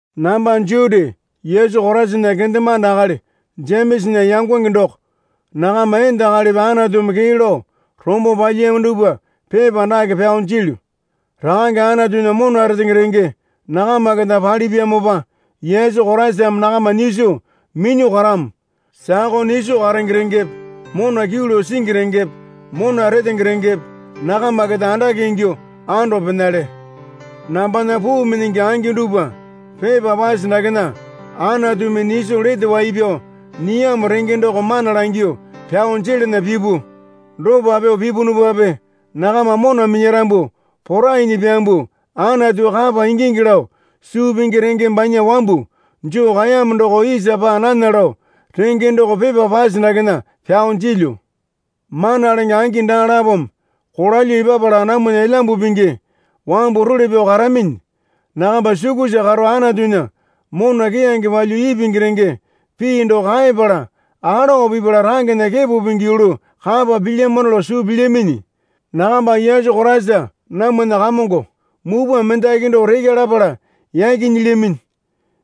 Namba Juti Yesu Koraisana kendemande akali Jemesana yangonge doko. Nakama enda akalipi Anatumi kee lao rombo palyiyamo dupwa pepa dake pyao jilyu. Rakange Anatunya mona retenge renge nakama keta palipyamopa Yesu Koraisame nakama nyiso minyuo karamo. Sakao nyiso karenge rengepe mona kyuu lao singi rengepe mona retenge rengepe nakama keta andake ingyuo ando penale. Nambana puu minyingi angi dupwa, pepa pase dakena Anatumi nyiso lete wai pyao nyiyamo renge doko mana langyuo pyao jelana pipu. Dopa pyuo pipunupape nakama mona minyarambu porainyi pyambuo Anatu kapa ingingi lao suu pingi renge banya wambu joo kaeyamo doko isa paa nana lao renge doko pepa pase dakena pyao jilyu. Mana lenge angi daa lapome kolalyuo epapala namwana Elyambu Pingi wambu role pyao karaminyi. Nakama sukusa karo Anatunya mona keyange palyuo ipingi renge pii doko kaepala alowa pipala rangena kepo pingi yulu kapa pilyamano lao suu pilyaminyi. Nakamba Yesu Koraisa namwana Kamongo mupwa mendaki doko rekya lapala yaki nyilyaminyi.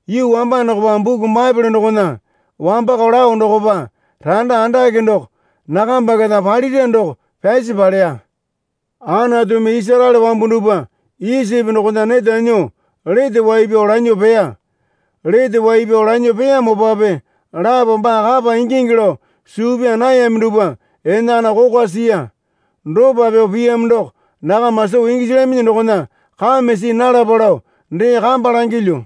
Yuu wamba dokopa buku Baepole dokona wambakao lao dokopa randa andake doko nakamba keta palira doko pyasi paleya. Anatumi Isaraele wambu dupwa Isipi dokona neta nyuo lete wai pyao lanyuo peya. Lete wai pyao lanyuo peyamopape lapo baa kapa ingingi lao suu pyaa nayami dupwa enakana kokwa siya. Dopa pyuo piyamo doko nakama soo gisilyaminyi dokona kame see nalapa lao dee kamba langilyu.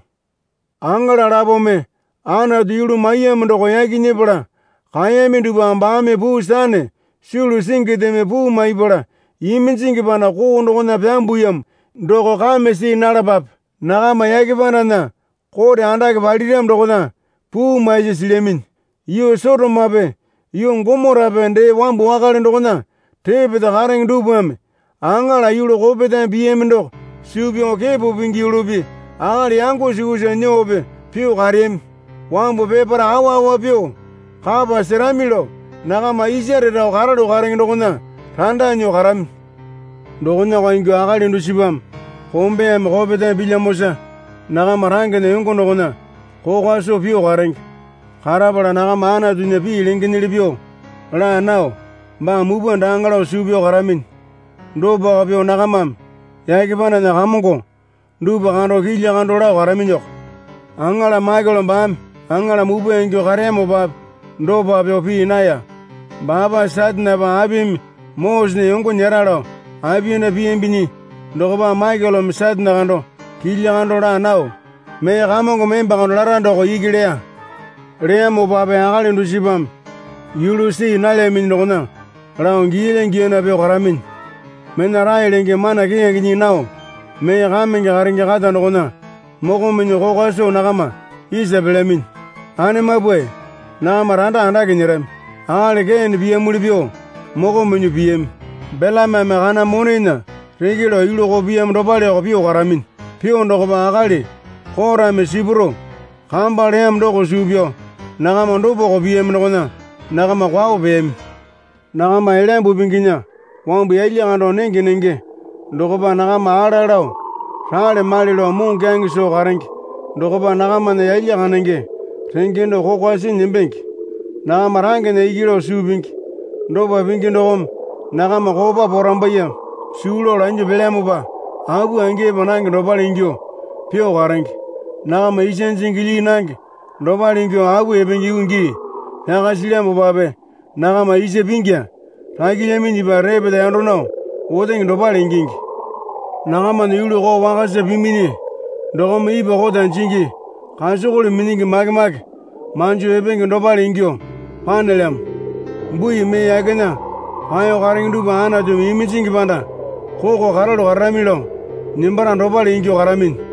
Aŋala lapome Anatu yulu maiyamo doko yaki nyepala kaeyami dupwa baame puu sane sulu singindeme puu maipala iminjingi panda koo dokona pyambuyamo doko kame see nalapape. Nakama yake pandana kote andake paliramo dokona puu maisi silyaminyi. Yuu Sotomape yuu Gomorape dee wambu wakale dokona repeta karenge dupwame aŋala yulu kopetame piyami doko suu pyao kepo pingi yulupi akali yango sukusa nyuope pyuo kareyami. Wambu peparae awa awa pyuo kapa serami lao nakama isare rao karalu karenge dokona randa nyuo karaminyi. Dokonako ingyuo akali dusipame kombeyame kopetame pilyamosa nakama rangena yango dokona kokwa soo pyuo karenge. Karapala nakama Anatunya pii lengenyili pyuo laa nao baa mupwa daaŋa lao suu pyao karaminyi. Dopako pyuo nakamame yake pandana kamongo dupwa kando kilya kando lao karaminyiko. Aŋala Maikele baame aŋala mupwa ingyuo kareyamopape dopa pyuo pii naya. Baapa Satanepa apimi Mosesena yongo nyera lao apiyanda piyambinyi dokopa Maikeleme Satane kando kilya kando laa nao mee Kamongome emba kando lara doko iki leya. Leyamopape akali dusipame yulu see nalyaminyi dokona lao giyalya giyana pyuo karaminyi. Mena rae lenge mana keyange nyii nao mee kamenge karenge kata dokona moko minyuo kokwa soo nakama isa pelyaminyi. Anemapwae nakama randa andake nyerami. Akali Kene piyamuli pyuo moko minyuo piyami. Belameme kana monena reke lao yulu koo piyamo dopaleko pyuo karaminyi. Pyuo dokopa akali Korame sipuro kamba leyamo doko suu pyao nakama dopako piyami dokona nakama kwao peyami. Nakama Elyambu Pinginya wambu yalya kando nenge nenge dokopa nakama ala lao rale male lao moŋokyaŋe soo karenge dokopa nakamana yalya kandenge renge doko kokwa sinyi nembenge. Nakama rangena iki lao suu pingi. Dopa pingi dokome nakama kopa porambaiyeme suu lao lanyuo paelyamopa apu angi epa nange dopale ingyuo pyuo karenge. Nakama isa jingi lyii nange dopale ingyuo apu epenge yuu gii pyaka silyamopape nakama isa pingya rakilyaminyipa repeta yando nao otenge dopale ingingi. Nakamana yulu koo wakasa piminyi dokome ipwa kota jingi kasokole minyingi make make manjo epenge dopale ingyuo panelyamo. Bui mee yakena paeyo karenge dupwa Anatumi iminjingi panda koko karalu kararami lao nembara dopale ingyuo karaminyi.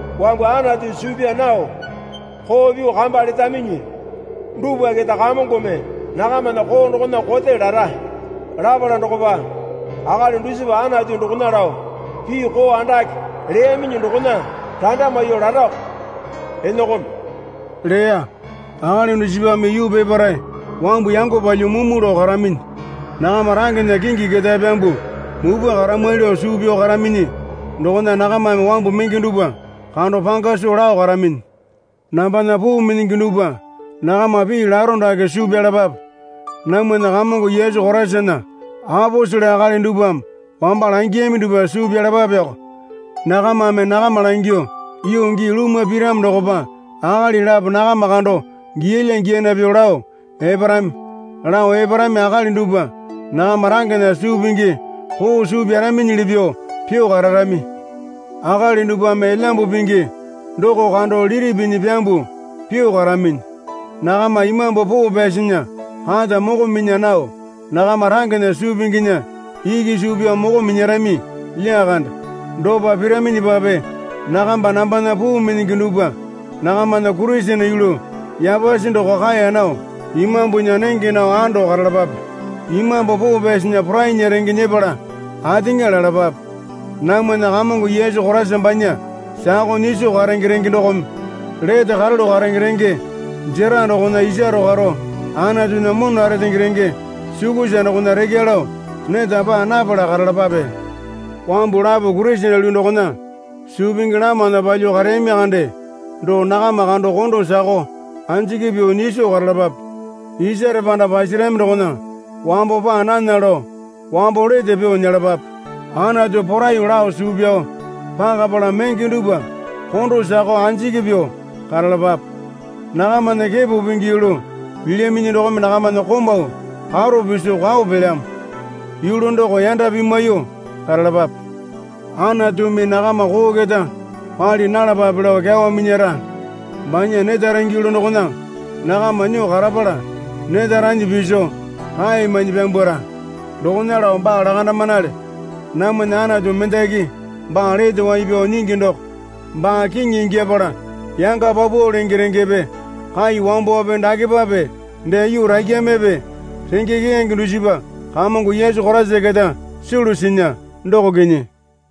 Wambu Anatu suu pyaa nao koo pyuo kamba letaminyi dupwa keta Kamongome nakamana koo dokona kote lara. Lapala dokopa akali dusipa Anatu dokona lao pii koo andake leyaminyi dokona randa maiyuo larako, Inokome leya. Akali dusipame yuu peparae wambu yango palyuo mumu lao karaminyi. Nakama rangena kingi ketae pyambuo mupwa karamwali lao suu pyao karaminyi dokona nakamame wambu menge dupwa kando panga soo lao karaminyi. Nambana puu minyingi dupwa, nakama pii laro dake suu pyalapape. Namwana Kamongo Yesu Koraisana aposele akali dupwame wamba langiyami dupwa suu pyalapapeko. Nakamame nakama langyuo, Yuu gii lumwa piramo dokopa akali lapo nakama kando giyalya giyana pyuo lao eparami. Lao eparami akali dupwa nakama rangena suu pingi koo suu pyaraminyili pyuo pyuo kararami. Akali dupwame Elyambu Pingi doko kando lili pinyi pyambuo pyuo karaminyi. Nakama Imambu Poo Pyasinya kata moko minya nao nakama rangena suu pinginya iki suu pyao moko minyarami lyakande. Dopa piraminyipape nakamba nambana puu minyingi dupwa nakamana Kurisene yulu yapasi doko kaeya nao Imambunya nenge nao ando karalapape. Imambu Poo Pyasinya porainya renge nyepala ateŋa lalapape. Namwana Kamongo Yesu Koraisa banya sakao nyiso karenge renge dokome lete karalu karenge renge jera dokona isaro karo Anatunya mona retenge renge sukusa dokona rekya lao neta paa napala karalapape. Wambu lapo Kurisene yulu dokona suu pingi lamana palyuo kareyami kande doko nakama kondo sakao anjiki pyuo nyiso karalapape. Isare panda pasarami dokona wambo paa nana lao wambo lete pyuo nyelapape. Anatu poraiyuo lao suu pyao pakapala menge dupwa kondo sakao anjiki pyuo karalapape. Nakamana kepo pingi yulu pilyaminyi dokome nakamana komau karo piso kwao pelyamo. Yulu doko yanda pimwaiyuo karalapape. Anatumi nakama koo keta pali nalapale lao kyawa minyara. Banya neta renge yulu dokona nakama nyuo karapala neta ranyi piso rae mainyi pyambwara. Dokona lao baa lakandamanale. Namwana Anatu mendaki baa lete wai pyao nyingi doko baa kiŋi ingyapala yanga paupau lenge rengepe kai wambowape dakepape dee yuu rakyamepe renge keyange dusipa Kamongo Yesu Koraisa keta sulu sinya, doko kinyi.